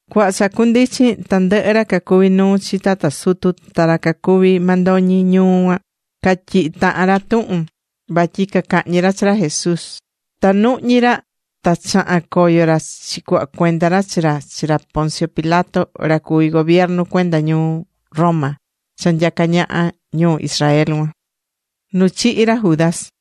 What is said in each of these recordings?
Cuhva cha cundichin, tandɨhɨ ra cacuví nuu chi tata sutu ta ra cacuví mandoñi ñuu cuan, catyihi̱ tahan ra tuhun vatyi cacahñi ra chi ra Jesús. Ta nuhñí ra. Ta chaha̱n coyo ra chicuhva cuenda ra chi ra chi ra Poncio Pilato, ra cuví gobiernu cuenda ñuu Roma cha nyacá ñaha ñuu Israel cuan.Nu chihi̱ ra Judas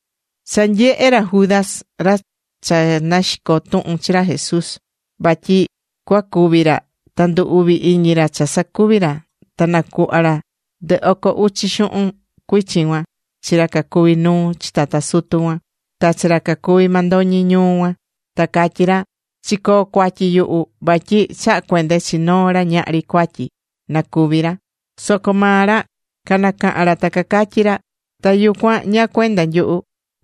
Cha nyehe̱ ra Judas, ra cha naxico̱ tuhun chi ra Jesús, vatyi cuacúvi ra, ta ndu uvi̱ iñi ra cha sacuvi̱ ra, ta nacuhva ra ndɨ oco uchi xuhun cuichin cuan chi ra cacuví nuu chi tata sutu cuan, ta chi ra cacuví mandoñi ñuu cuan. Ta catyí ra: ―Chicoo̱ cuatyi yuhu, vatyi chaha̱ cuende chi noo ra ñahri cuatyi na cúvi ra. Soco maa ra canacaha̱n ra ta cacatyí ra: ―Ta yucuan ¿ñáá cuenda nyuhu?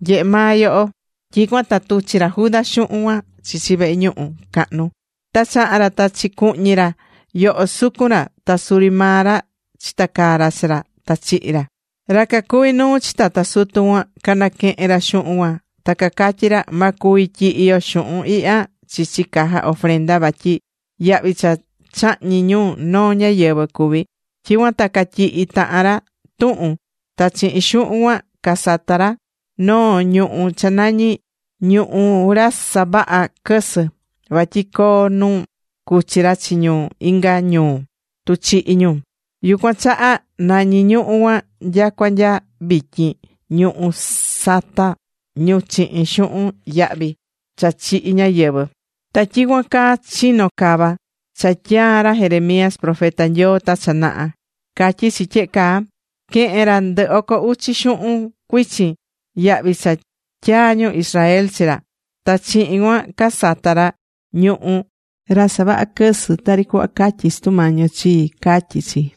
¡Nye̱he maa yoho! Tyicuan ta tuchi̱ ra Judas xuhun cuan chichi vehe ñuhu cahnu, ta chaha̱n ra ta chicuhñi̱ ra yoho sucun ra ta suri maa ra chitacaa̱ ra chi ra. Ta chihi̱ ra. Ra cacuví nuu chi tata sutu cuan canaquehe̱n ra xuhun cuan ta cacatyí ra: ―Ma cuvi tyihi yo xuhun ihya chichi caja ofrenda vatyi yahvi cha chahñi̱ ñu noo ñáyɨvɨ cuví. Tyicuan ta catyihi̱ tahan ra tuhun, ta chihin xuhun cuan casata̱ ra noo ñuhú cha nañí Ñuhú Ra Savahá Quɨsɨ. Vatyi coo nu cuchi ra chi ñu inga ñuu tu chihi ñu. Yucuan chaha nañí ñuhú cuan nyacua nya vityin Ñuhú Sata Ñu Chihin Xuhun Yahvi Cha Chihi̱ Ñáyɨvɨ. Ta tyicuan caa chino̱ cava cha tyaa̱ ra Jeremías profeta Nyoo ta cha naha. Catyí chi tyehe caa: “Quehe̱n ra ndɨ oco uchi xuhun cuichin, yahvi cha tyaa̱ ñu Israel chi ra. Ta chihin cuan, casata̱ ra Ñuhú Ra Savahá Quɨsɨ, tari cuhva catyí Sutu Mañi yo chii”, catyí chi.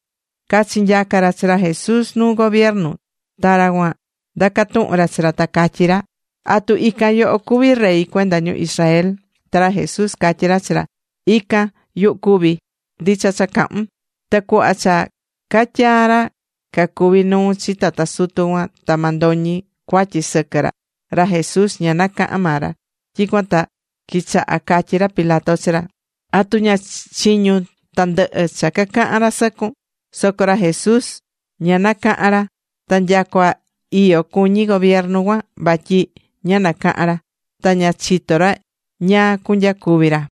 Cachinyaca̱ ra chi ra Jesús nuu gobiernu, ta ra cuan ndaca̱ tuhun ra chi ra, ta catyí ra: ―¿Atu ican yoho cuví rey cuenda ñu Israel? Ta ra Jesús catyí ra chi ra: ―Ican, yuhu cuví. Ndicha cha cahún. Ta cuhva cha catyaa̱ ra cacuví nuu chi tata sutu cuan ta mandoñi cuatyi sɨquɨ ra, ra Jesús ña nacahan maa ra. Tyicuan ta quichaha̱ catyí ra Pilato chi ra: ―¿Atu ña chiñún tandɨhɨ cha cacahán ra sɨcun? Soco ra Jesús ña nacahan ra. Ta nyacua iyo cuñí gobiernu cuan vatyi ña nacaha̱n ra. Ta ña chitó ra ñáá cunyacuvi ra.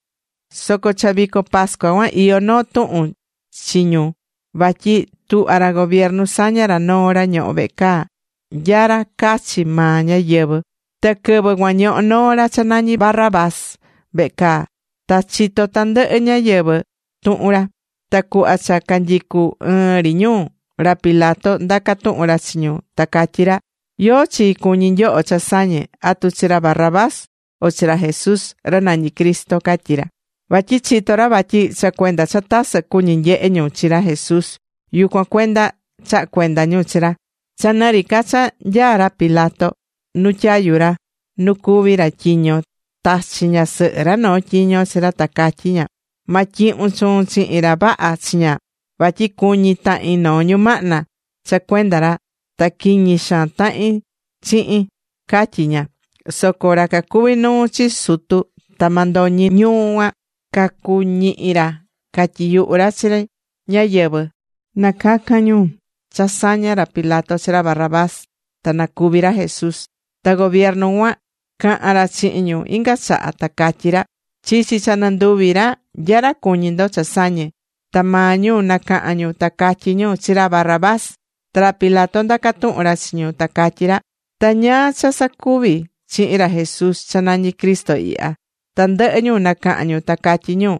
Soco cha vico pascua cuan, iyó noo tuhun chi ñu vatyi tuhva ra gobiernu saña ra noo ra ñohó vehe caa, nya ra cachi maa ñáyɨvɨ. Ta quɨvɨ cuan ñohó noo ra cha nañi Barrabás vehe caa. Ta chitó tandɨhɨ ñáyɨvɨ tuhun ra. Ta cuhva cha canyicú ɨɨn ri ñu, ra Pilato ndaca̱ tuhun ra chi ñu, ta catyí ra: ―¿Yóó chi cuñí nyoho cha sañe? ¿Atu chi ra Barrabás o chi ra Jesús, ra nañí Cristo? ―catyí ra. Vatyi chitó ra vatyi cha cuenda cha tasɨ cuñí nyehe ñu chi ra Jesús, yucuan cuenda chaha̱ cuenda ñu chi ra. Cha nɨ ri ca cha nyaá ra Pilato nu tyayu ra, nu cuví ra tyiño, tachi̱ ñasɨhɨ ra noo tyiño chi ra ta catyí ña: “Ma tyihun chuun chihin ra vaha chiña. Vatyi cuñi tahi̱n noo ñumahna cha cuenda ra. Ta quiñi xaan tahi̱n chihin”, catyí ña. Soco ra cacuví nuu chi sutu ta mandoñi ñuu cuan, cacuñihi ra catyiyuhu ra chi ñáyɨvɨ na cacan ñu cha saña ra Pilato chi ra Barrabás, ta na cúvi ra Jesús. Ta gobiernu cuan caha̱n ra chihin ñu inga chaha, ta catyí ra: ―Chichi cha nɨnduvi ra, ¿nya ra cuñí ndo cha sañe? Ta maa ñu nacaha̱n ñu, ta catyí ñu: ―Chi ra Barrabás. Ta ra Pilato ndaca̱ tuhun ra chi ñu, ta catyí ra: ―¿Ta ñáá cha cusacuvi chihin ra Jesús cha nañí Cristo ihya? Tandɨhɨ ñu nacaha̱n ñu ta catyí ñu: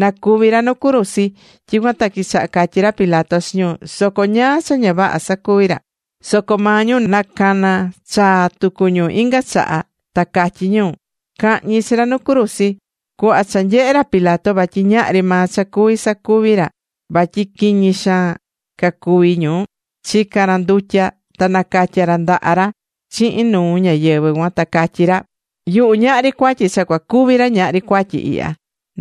―¡Na cúvi ra nu cruzi! Tyicuan ta quichaha̱ catyí ra Pilato chi ñu: ―Soco ¿ñáá cha ña vaha sacuvi̱ ra? Soco maa ñu nacana̱ chaa tucu ñu inga chaha ta catyí ñu: ―¡Ca̱hñi chi ra nu cruzi! Cuhva cha nyehe̱ ra Pilato vatyi ñahri maa cha cuví sacuvi ra, vatyi quiñi xaan cacuví ñu, chica̱n ra ndutya, ta nacatya̱ ra ndaha ra chihin nuu ñáyɨvɨ cuan, ta catyí ra: ―Yuhu ñahri cuatyi cha cua cúvi ra ñahri cuatyi ihya.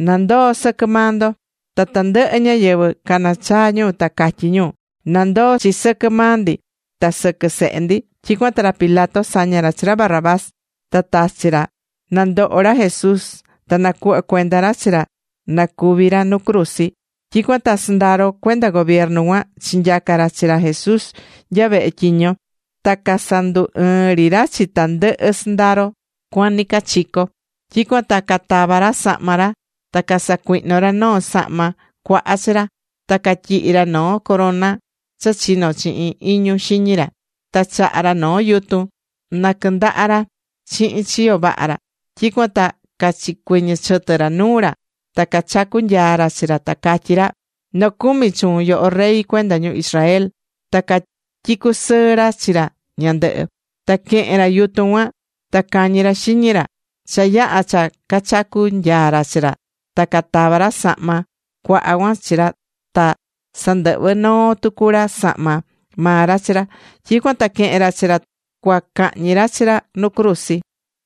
Na ndoo sɨquɨ maa ndo. Ta tandɨhɨ ñáyɨvɨ canacaha̱n ñu, ta catyí ñu: ―Na ndoo chi sɨquɨ maa ndi ta sɨquɨ sehe ndi. Tyicuan ta ra Pilato saña̱ ra chi ra Barrabás, ta tachi̱ ra na ndoho ra Jesús, ta nacuhva̱ cuenda ra chi ra na cúvi ra nu cruzi. Tyicuan ta sɨndaro cuenda gobiernu cuan chinyaca̱ ra chi ra Jesús nya vehe tyiño, ta casandu ɨɨ̱n ri ra chi tandɨhɨ sɨndaro cuan nɨcachico. Tyicuan ta catava̱ ra sahma ra ta casacuihno̱ ra noo sahma cuaha chi ra. Ta catyihi̱ ra noo corona cha chino̱ chihin iñu xiñi ra. Ta chaha̱ ra noo yutun na quɨndaha ra chihin chiyo vaha ra. Tyicuan ta cachicuiñi̱ chɨtɨ ra nuu ra, ta cachacu̱ nyaa ra chi ra ta catyí ra: ―¡Nocumi chuun, yoho Rey cuenda ñu Israel! Ta catyicu̱ sɨɨ ra chi ra ñandɨhɨ. Ta quehe̱n ra yutun cuan ta cañi̱ ra xiñi ra. Cha yaha̱ cha cachacu̱ nyaa ra chi ra ta catava̱ ra sahma cuaha cuan chi ra ta sandɨhvɨ̱ noo tucu ra sahma maa ra chi ra. Tyicuan ta quehe̱n ra chi ra cua cahñi ra chi ra nu cruzi.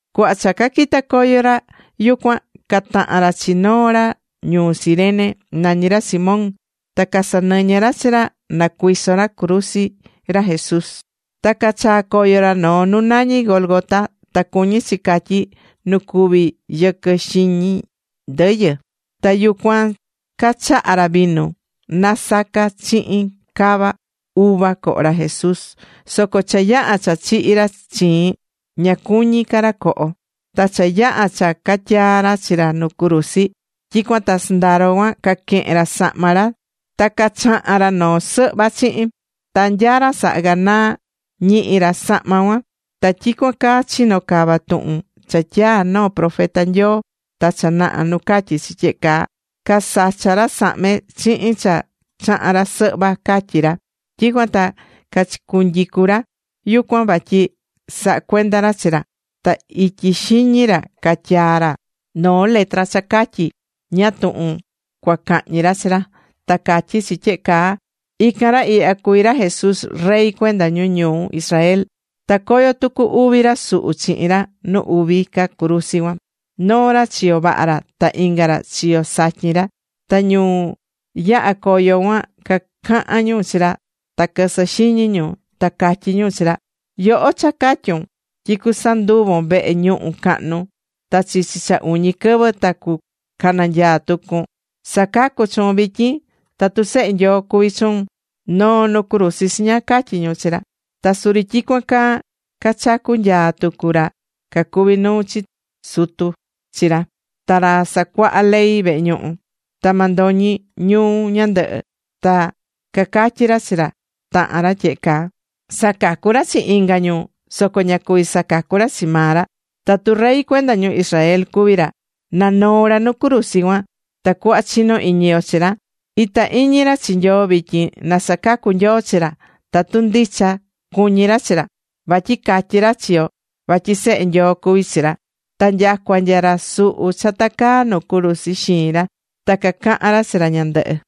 Cuhva cha caquita̱ coyo ra yucuan, cataha̱n ra chi noo ra ñuu Cirene, nañí ra Simón. Ta casanɨñɨ̱ ra chi ra na cuiso ra cruzi ra Jesús. Ta cachaa̱ coyo ra noo nu nañí Gólgota, ta cuñí chi catyí Nu Cuví Yɨquɨ Xiñi Ndɨyɨ. Ta yucuan cachaha̱ ra vinu nasaca̱ chihin cava uva coho ra Jesús. Soco cha yaha̱ cha chihi̱ ra chiin, ña cuñí ca ra coho. Ta cha yaha̱ cha catyaa̱ ra chi ra nu cruzi, tyicuan ta sɨndaro cuan caquehe̱n ra sahma ra ta chaha̱n ra noo sɨhva chihin. Ta nya ra saha ganaa, ñihi̱ ra sahma cuan. Ta tyicuan caa chino̱ cava tuhun cha tyaa̱ noo profeta Nyoo ta cha naha nu catyí chi tyehe caa: “Casacha̱ ra sahme chihin cha chaha̱n ra sɨhva”, catyí chi. Tyicuan ta cachicunyicu̱ ra yucuan vatyi saha cuenda ra chi ra. Ta ityi xiñi ra catyaa̱ ra noo letra cha catyí ñáá tuhun cua cahñi ra chi ra. Ta catyí chi tyehe caa: “Ican ra ihya cuví ra Jesús, rey cuenda ñu ñuu Israel.” Tacoyó tucu uvi ra suhu chihin ra nu uvi ca cruzi cuan. Noo ra chiyo vaha ra, ta inga ra chiyo satyin ra. Ta ñu yahá coyo cuan, cacahán ñu chi ra, ta quɨsɨ xiñi ñu, ta catyí ñu chi ra: ―¡Yoho cha catyu̱n tyi cusanduvon vehe ñuhu cahnu, ta chichi cha uñi quɨvɨ ta nacananyaa tucun! ¡Sa̱cacu chuun vityin! ¡Tatu Sehe Nyoo cuví chuun, no̱o nu cruzi chiña! ―catyí ñu chi ra. Ta suri tyicuan caa cachacú nyaa tucu ra cacuví nuu chi tata sutu chi ra, ta ra sacuahá ley vehe ñuhu, ta mandoñi ñuu ñandɨhɨ. Ta cacatyí ra chi tahan ra tyehe caa: ―Sacacu̱ ra chi inga ñu, soco ña cuví sacacu ra chi maa ra. Tatu Rey cuenda ñu Israel cuví ra, na noo ra nu cruzi cuan, tacuhva chino iñi yo chi ra. Itá iñi ra chi Nyoo, vityin na sacacu Nyoo chi ra, tatu ndicha cuñí ra chi ra. Vatyi catyi̱ ra chi yo vatyi Sehe Nyoo cuví chi ra. Ta nyacua nya ra suhu cha tacaá nu cruzi xiin ra ta cacaha̱n ra chi ra ñandɨhɨ.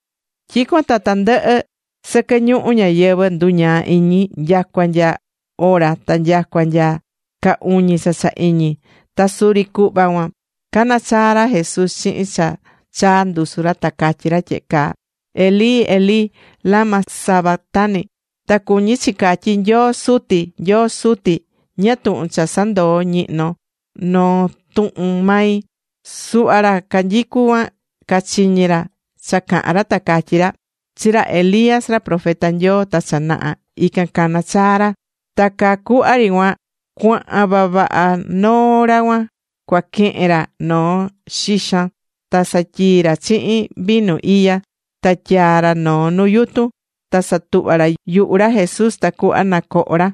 Tyicuan ta tandɨhɨ sɨquɨ ñuhu ñayɨvɨ̱ nduñaa̱ iñi, nyacua nya ora ta nyacua nya ca uñi cha cha iñi. Ta suri cuhva cuan, cana̱ chaa ra Jesús chihin cha chaa ndusu ra. Ta catyí ra tyehe caa: ―Elí, Elí, ¿lama sabactani? ―ta cuñí chi catyí: Nyoo Suti, Nyoo Suti, ¿ñáá tuhun cha sandoó ñihnon noo tuhun mai? Suhva ra canyicú cuan, cachiñi̱ ra cha caha̱n ra, ta cacatyí ra: ―Chi ra Elías, ra profeta Nyoo ta cha naha, ican cana̱ chaa ra. Ta caa cuhva ri cuan, cuahan vavaha noo ra cua quehen ra noo xixan, ta satyii̱ ra chihin vinu iya, ta tyaa̱ ra noo nu yutun, ta satuhva̱ ra yuhu ra Jesús tacuhva na coho ra.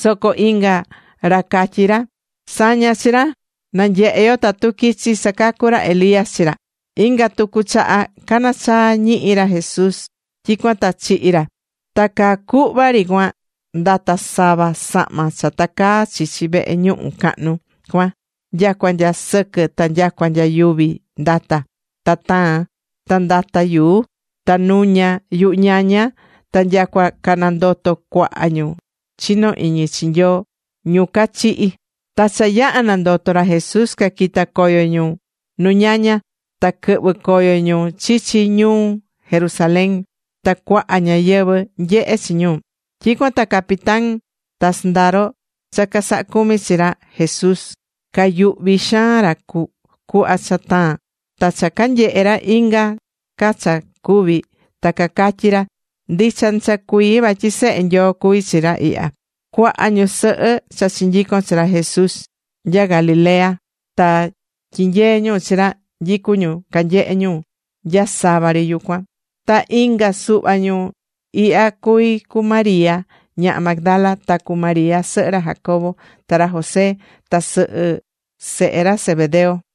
Soco inga ra cacatyí ra: ―Sa̱ña chi ra. Na nyehe yo tatu quichi sacacu ra Elías chi ra. Inga tucu chaha cana̱ chaa ñihi ra Jesús, tyicuan ta chihi̱ ra. Ta caa cuhva ri cuan ndata̱ sava sahma cha tacaá chichi vehe ñuhu cahnu cuan, nyacua nya sɨquɨ ta nyacua nya yuvi ndata̱. Ta taa̱n. Ta ndata̱ yuu. Ta nuña̱ yuhu ñaña. Ta nyacua canandoto̱ cuaha ñu chinó iñi chi Nyoo, ñu cachihi̱. Ta cha yaha̱ nandoto ra Jesús caquita̱ coyo ñu nu ñaña ta quɨhvɨ̱ coyo ñu chichi ñuu Jerusalén, ta cuaha ñáyɨvɨ nyehe chi ñu. Tyicuan ta capitán ta sɨndaro cha casahá cumi chi ra Jesús, cayuhvi xaan ra cuhva cha taa̱n. Ta cha canyehe̱ ra inga ca cha cuvi̱, ta cacatyí ra: ―Ndicha ndicha cuii, vatyi Sehe Nyoo cuví chi ra ihya. Cuaha ñusɨhɨ cha chinyico̱n chi ra Jesús nya Galilea ta tyinyee̱ ñu chi ra, nyicú ñu canyehé ñu nya sava ri yucuan. Ta ican suhva ñu ihya cuví cu María ñaha Magdala, ta cu María sɨhɨ ra Jacobo ta ra José, ta sɨhɨ sehe ra Zebedeo.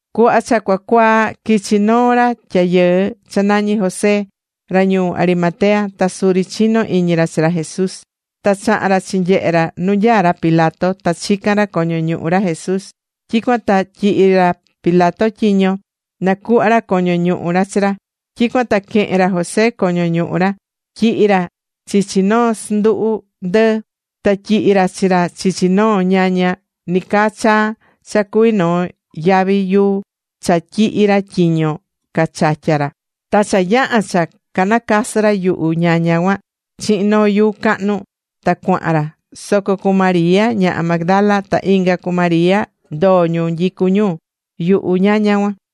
Cuhva cha cua cuaa, quichi noo ra tyayɨɨ cha nañí José. Ra ñuu Arimatea. Ta suri chinó iñi ra chi ra Jesús. Ta chaha̱n ra chinyehe̱ ra nu nyaá ra Pilato, ta chica̱n ra coño ñuhu ra Jesús. Tyicuan ta tyihi̱ ra Pilato tyiño na cuhva ra coño ñuhu ra chi ra. Tyicuan ta quehe̱n ra José coño ñuhu ra, tyihi̱ ra chichi noo sɨnduhu ndɨɨ. Ta tyihi̱ ra chi ra chichi noo ñaña nicaa chaa cha cuví noo yavi yuu cha tyihi̱ ra tyiño cachatya ra. Ta cha yaha̱ cha nacasɨ ra yuhu ñaña cuan chihin noo yuu cahnu, ta cuahan ra. Soco cu María ñaha Magdala, ta inga cu María, ndoo ñu nyicú ñu yuhu ñaña cuan.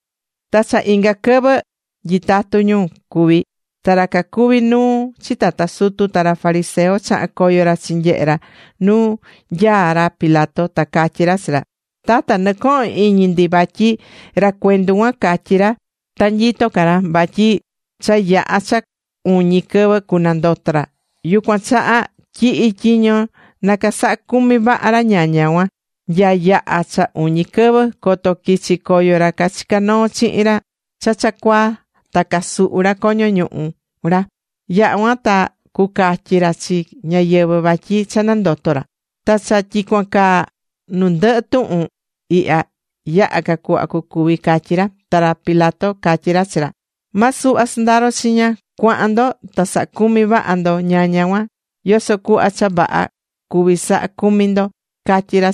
Ta cha inga quɨvɨ, quɨvɨ nyitatú ñu cuví, ta ra cacuví nuu chi tata sutu, ta ra fariseo chaha̱n coyo ra chinyehe̱ ra nu nyaá ra Pilato. Ta catyí ra chi ra: ―Tata, nɨcohón iñi ndi vatyi ra cuendu cuan, catyí ra ta nyitó ca ra vatyi cha yaha cha uñi quɨvɨ cunandoto ra. Yucuan chaha tyi̱hi tyiño na casaha cumi vaha ra ñaña cuan, nya yaha cha uñi quɨvɨ, coto quichi coyo ra cachica̱ noo chihin ra cha cha cuaa, ta casuhu ra coño ñuhu ra. Yaha cuan ta cucatyi ra chi ñáyɨvɨ vatyi cha nandoto ra. Ta cha tyicuan caa nu ndɨhɨ tuhun ihya, yaha ca cuhva cucuvi ―catyí ra. Ta ra Pilato catyí ra chi ra: ―Ma suhva sɨndaro chiña. Cua̱han ndo, ta sa̱ha cumi vaha ndo ñaña cuan, yoso cuhva cha vaha cuví saha cumi ndo ―catyí ra.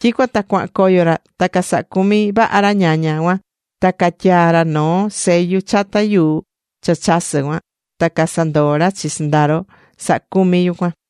Tyicuan ta cuahan coyo ra, ta casaha̱ cumi vaha ra ñaña cuan, ta catyaa̱ ra noo sellu chata yuu cha chasɨ́ cuan. Ta casandoo̱ ra chi sɨndaro sahá cumi yucuan.